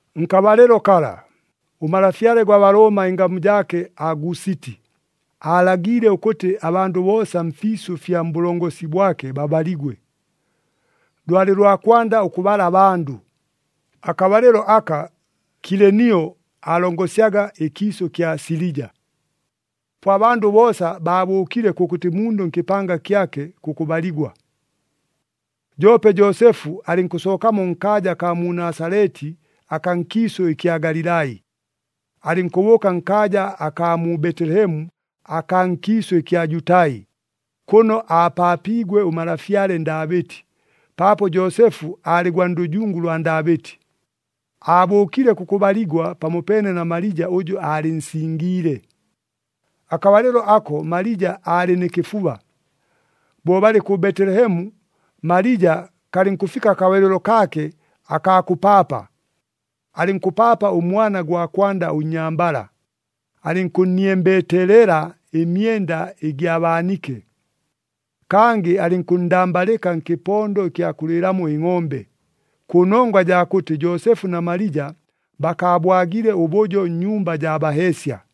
Nkabalɨlo kala, ʉmalafyale gwa Balooma ɨngamu jaake Agusiti, aalagiile ʉkʉtɨ abandʉ boosa mfiisʉ fya mbʉlongosi bwake babaligwe. Lwalɨ lwa kwanda ʉkʉbala abandʉ, akabalɨlo aka Kilenio aalongosyaga ɨkiisʉ kya Silija. Po abandʉ boosa baabʉʉkile kʉkʉtɨ mundʉ nkɨpanga kyake kʉkʉbaligwa. Joope Joosefu alɨnkʉsookamo nkaaja akaa mu Nasaleti akaa nkiisʉ ɨkya Galilai, alɨnkʉbʉʉka nkaaja akaa mu Betelehemu akaa nkiisʉ ɨkya Jutai, kʉno aapaapiigwe ʉmalafyale Ndaabɨti, paapo Joosefu aalɨ gwa ndʉjungu lwa Ndaabɨti. Aabʉʉkile kʉkʉbaligwa pamopeene na Malija ʉjʉ aalɨnsingiile. Akabalɨlo ako Malija aalɨ nɨ kɨfuba. Bo balɨ kʉ Betelehemu, Malija kalɨnkʉfika akabalɨlo kaake akaa kʉpaapa. Alɨnkʉpaapa ʉmwana gwa kwanda ʉnnyambala, alɨnkʉnniembeteelela ɨmyenda ɨgya baanike. Kangɨ alɨnkʉnndambalɨka nkɨpondo ɨkya kʉlɨɨlamo ɨngʼombe, kʉnongwa jaa kʉtɨ Joosefu na Malija bakaabwagile ʉbʉjo nnyumba jaa baheesya.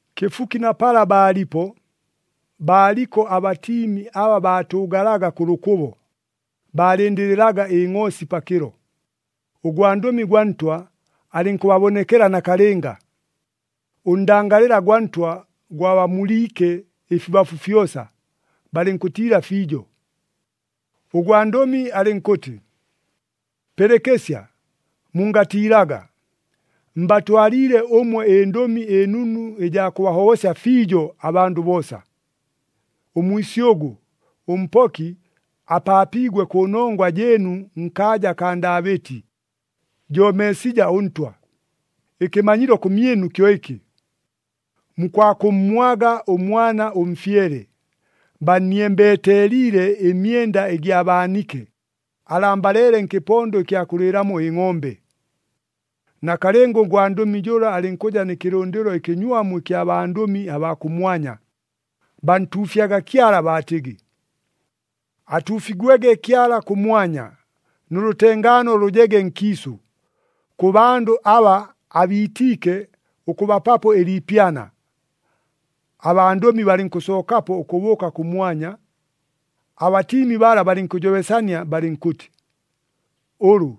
Kɨfuki na pala baalipo, baaliko abatiimi aba baatʉʉgalaga kʉ lʉkʉbo, baalɨndɨlɨlaga ɨngʼoosi pakɨlo. Ʉgwandʉmi gwa Ntwa alɨnkʉbabonekela nakalɨnga, ʉndangalɨla ʉgwa Ntwa gwabamuliike ɨfibafu fyosa, balɨnkʉtiila fiijo. Ʉgwandʉmi alɨnkʉtɨ, “Pɨlɨkɨsya, mungatiilaga, mbatwaliile ʉmwe ɨndʉmi ɨnunu ɨjaa kʉbahobosya fiijo abandʉ boosa. Ʉmwisyʉgʉ, ʉMpoki apaapiigwe kʉnongwa jɨɨnu nkaaja akaa Ndaabɨti, jo Meesija ʉNtwa. Ɨkɨmanyilo kʉmyɨnu kyo ɨkɨ. Mukwakʉmmwaga ʉmwana ʉmfyele, banniembeteeliile ɨmyenda ɨgya baanike, alambaleele nkɨpondo ɨkya kʉlɨɨlamo ɨngʼombe.” Nakalɨnga ʉgwandʉmi jʉla alɨnkʉja nɨ kɨlʉndɨlo ɨkɨnywamu ɨkya bandʉmi abaa kʉmwanya, bantuufyaga Kyala baatɨgɨ, “Atuufigwege Kyala kʉmwanya, nʉ lʉtengaano lʉjege nkiisʉ, kʉ bandʉ aba abiitiike ʉkʉbapapo ɨliipyana.” Abandʉmi balɨnkʉsookapo ʉkʉbʉʉka kʉmwanya, abatiimi bala balɨnkʉjobesania balɨnkʉtɨ, “Ʉlʉ,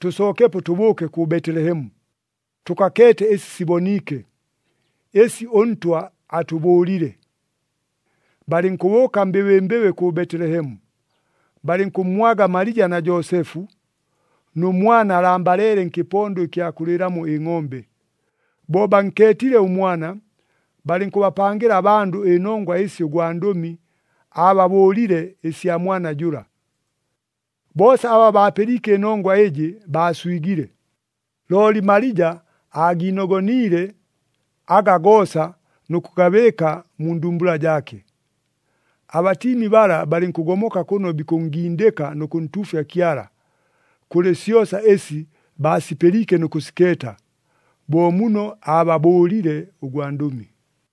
tʉsookepo tʉbʉʉke kʉ Betelehemu, tʉkakeete ɨsi siboniike, ɨsi ʉNtwa atʉbʉʉlile.” Balɨnkʉbʉʉka mbɨbɨmbɨbɨ kʉ Betelehemu. Balɨnkʉmmwaga Malija na Joosefu, nʉ mwana alambaleele nkɨpondo ɨkya kʉlɨɨlamo ɨngʼombe. Bo bankeetile ʉmwana, balɨnkʉbapangɨla abandʉ ɨnongwa ɨsi ʉgwandʉmi aababʉʉlile ɨsya mwana jʉla. Boosa aba baapɨliike ɨnongwa ɨjɨ, baaswigile. Looli Malija aagiinogoniile aga goosa nʉ kʉgabɨɨka mu ndumbula jaake. Abatiimi bala balɨnkʉgomoka kʉno bikʉnngindɨka nʉ kʉntuufya Kyala, kʉlɨ syosa ɨsi baasipɨliike nʉ kʉsikeeta, bo muno ababʉʉlile ʉgwandʉmi.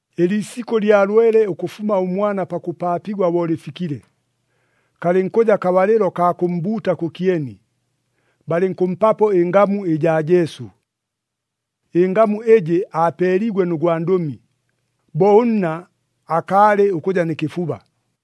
Ɨliisikʉ lya lwele ʉkʉfuma ʉmwana pakʉpaapigwa bo lɨfikile, kalɨnkʉja kabalɨlo kaa kʉmmbuuta kʉkyeni, balɨnkʉmpapo ɨngamu ɨjaa Jesu. Ɨngamu ɨjɨ aapeeliigwe nʉ gwandʉmi, bo ʉnna akaalɨ ʉkʉja nɨ kɨfuba.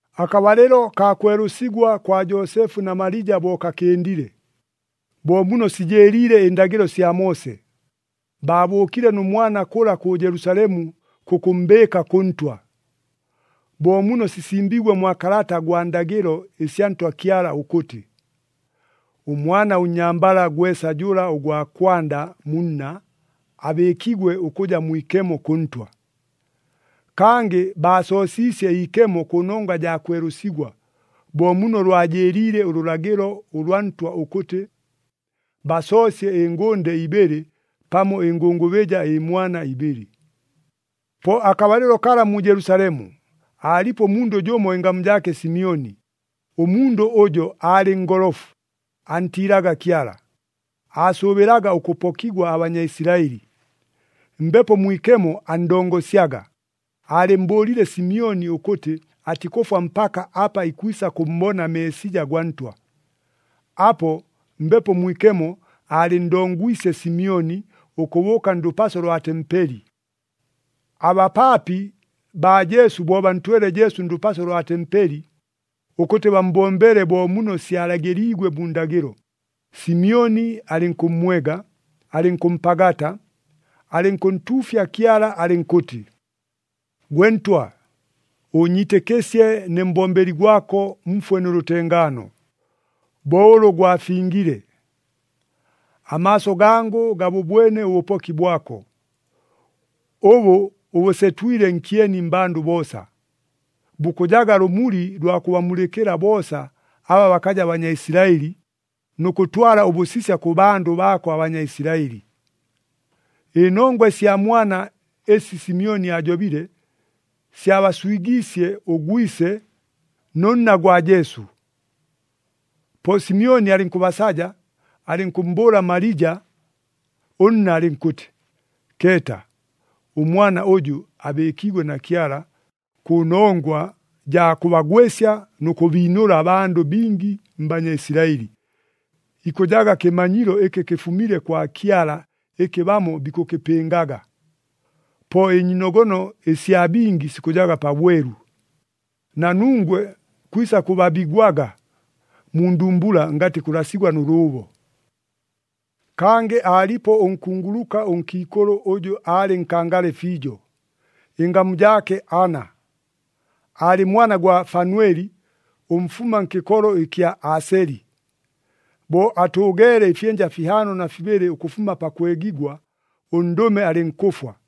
Akabalɨlo kaa kwelʉsigwa kwa Joosefu na Malija bo kakɨndile, bo muno sijɨɨliile ɨndagɨlo sya Moose, baabʉʉkile nʉ mwana kʉla kʉ Jelusalemu kʉkʉmmbɨɨka kʉ Ntwa. Bo muno sisimbiigwe mwa kalata gwa ndagɨlo ɨsya Ntwa Kyala ʉkʉtɨ, “Ʉmwana ʉnnyambala gwesa jʉla ʉgwa kwanda mu nna, abɨɨkigwe ʉkʉja mwikemo kʉ Ntwa.” Kangɨ baasoosiisye iikemo kʉnongwa jaa kwelʉsigwa, bo muno lwajɨɨliile ʉlʉlagɨlo ʉlwa Ntwa ʉkʉtɨ, basoosye ɨngʉnde ibɨlɨ pamo ɨngʉngʉbɨja ɨmwana ibɨlɨ. Po akabalɨlo kala mu Jelusalemu, aalipo ʉmundʉ jʉmo ɨngamu jaake Simyoni. Ʉmundʉ ʉjo aalɨ ngolofu, antiilaga Kyala, aasʉʉbɨlaga ʉkʉpokigwa aBanyaisilaɨli. Mbepo Mwikemo anndongosyaga, aalɨmmbʉʉlile Simyoni ʉkʉtɨ atikʉfwa mpaka apa ikwisa kʉmmbona Meesija gwa Ntwa. Apo, Mbepo Mwikemo aalɨnndongwisye Simyoni ʉkʉbʉʉka ndʉpaso lwa tempeli. Abapaapi baa Jesu bo bantwele Jesu ndʉpaso lwa tempeli, ʉkʉtɨ bammbombele bo muno syalagɨliigwe mu ndagɨlo, Simyoni alɨnkʉmmwega, alɨnkʉmpagata, alɨnkʉntuufya Kyala alɨnkʉtɨ, “Gwe Ntwa, ʉʉnyiitɨkɨsye ne mbombeli gwako mfwe nʉ lʉtengaano, bo ʉlʉ gwafingile. Amaaso gangʉ gabʉbwene ʉbʉpoki bwako, ʉbʉ ʉbʉsetwile nkyeni mmbandʉ boosa. Bukʉjaga lʉmuli lwa kʉbamulɨkɨla boosa aba bakaja Banyaisilaɨli, nʉ kʉtwala ʉbʉsisya kʉ bandʉ baako aBanyaisilaɨli.” Ɨnongwa ɨsya mwana ɨsi Simyoni aajobile, syabaswigiisye ʉgwise nʉ nna gwa Jesu. Po Simyoni alɨnkʉbasaja, alɨnkʉmmbʉʉla Malija ʉnna alɨnkʉtɨ, “Keeta, ʉmwana ʉjʉ abɨɨkiigwe na Kyala, kʉnongwa jaa kʉbagwɨsya nʉ kʉbiinʉla abandʉ bingi mBanyaisilaɨli. Ikʉjaga kɨmanyilo ɨkɨ kɨfumile kwa Kyala ɨkɨ bamo bikʉkɨpɨngaga. Po ɨnyiinogono ɨsya bingi sikʉjaga pabwelu. Na nungwe kwisa kʉbabigwaga mu ndumbula, ngatɨ kʉlasigwa nʉ lʉʉbo.” Kangɨ aalipo ʉnkunguluka ʉnkiikʉlʉ ʉjʉ aalɨ nkangale fiijo, ɨngamu jaake Ana. Aalɨ mwana gwa Fanweli ʉmfuma nkɨkolo ɨkya Aaseli. Bo atʉʉgeele ɨfyɨnja fihaano na fibɨlɨ ʉkʉfuma pakwegigwa, ʉndʉme alɨnkʉfwa.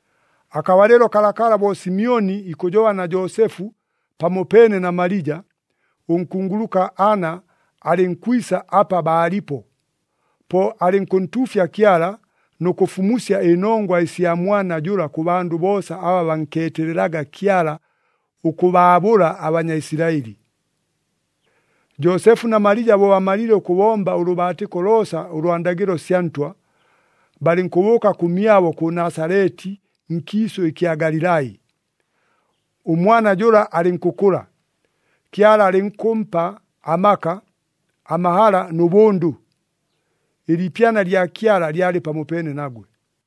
Akabalɨlo kalakala bo Simyoni ikʉjoba na Joosefu pamopeene na Malija, ʉnkunguluka Ana alɨnkwisa apa baalipo. Po alɨnkʉntuufya Kyala nʉ kʉfumusya ɨnongwa ɨsya mwana jʉla kʉ bandʉ boosa aba bankeetelelaga Kyala ʉkʉbaabʉla aBanyaisilaɨli. Joosefu na Malija bo bamalile ʉkʉbomba ʉlʉbaatɨko loosa ʉlwa ndagɨlo sya Ntwa, balɨnkʉbʉʉka kʉmyabo kʉ Nasaleti nkiisʉ ɨkya Galilai. Ʉmwana jʉla alɨnkʉkʉla, Kyala alɨnkʉmpa amaka, amahala nʉ bʉndʉ. Ɨliipyana lya Kyala lyalɨ pamopeene nagwe.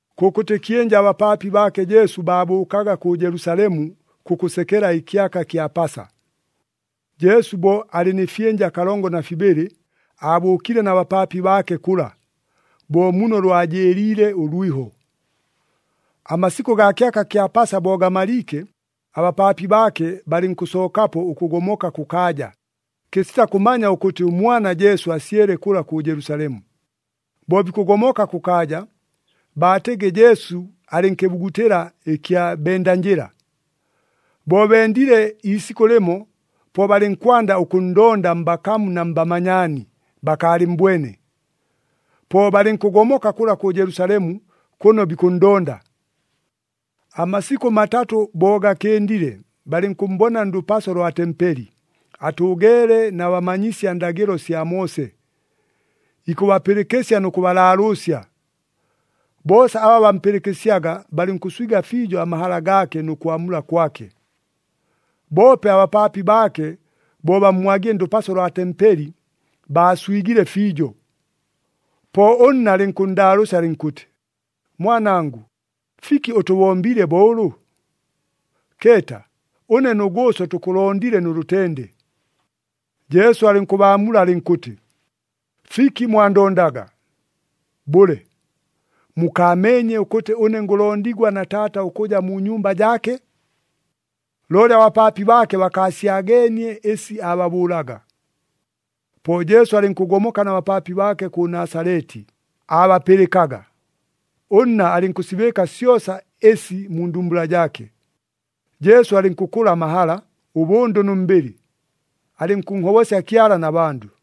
Kʉkʉtɨ kyɨnja abapaapi baake Jesu baabʉʉkaga kʉ Jelusalemu kʉkʉsekela ɨkyaka kya Pasa. Jesu bo alɨ nɨ fyɨnja kalongo na fibɨlɨ, aabʉʉkile na bapaapi baake kʉla, bo muno lwajɨɨliile ʉlwiho. Amasikʉ gaa kyaka kya Pasa bo gamaliike, abapaapi baake balɨnkʉsookapo ʉkʉgomoka kʉkaaja, kɨsita kʉmanya ʉkʉtɨ ʉmwana Jesu asyele kʉla kʉ Jelusalemu. Bo bikʉgomoka kʉkaaja, baatɨgɨ Jesu alɨ nkɨbugutɨla ɨkya bendanjɨla. Bo bendile iisikʉ lɨmo, po balɨnkwanda ʉkʉnndonda mbakamu na mbamanyaani, bakaalɨmmbwene. Po balɨnkʉgomoka kʉla kʉ Jelusalemu kʉno bikʉnndonda. Amasikʉ matatʉ bo gakɨndile, balɨnkʉmmbona ndʉpaso lwa tempeli, atʉʉgeele na bamanyisya ndagɨlo sya Moose, ikʉbapɨlɨkɨsya nʉ kʉbalaalʉʉsya. Boosa aba bampɨlɨkɨsyaga, balɨnkʉnswiga fiijo amahala gaake nʉ kwamula kwake. Boope abapaapi baake bo bammwagile ndʉpaso lwa tempeli, baaswigile fiijo. Po ʉnna alɨnkʉnndaalʉʉsya alɨnkʉtɨ, “Mwanangʉ, fiki ʉtʉbombiile bo ʉlʉ? Keeta! Ʉne nʉ gʉʉso tʉkʉlondile nʉ lʉtende!” Jesu alɨnkʉbaamula alɨnkʉtɨ, “Fiki mwandondaga? Bʉle, mukaameenye ʉkʉtɨ ʉne ngʉlondigwa na Taata ʉkʉja mu nyumba jaake?” Looli abapaapi baake bakaasyageenie ɨsi aababʉʉlaga. Po Jesu alɨnkʉgomoka na bapaapi baake kʉ Nasaleti, aabapɨlɨkaga. Ʉnna alɨnkʉsibɨɨka syosa ɨsi mu ndumbula jaake. Jesu alɨnkʉkʉla amahala, ʉbʉndʉ nʉ mbɨlɨ, alɨnkʉnhobosya Kyala na bandʉ.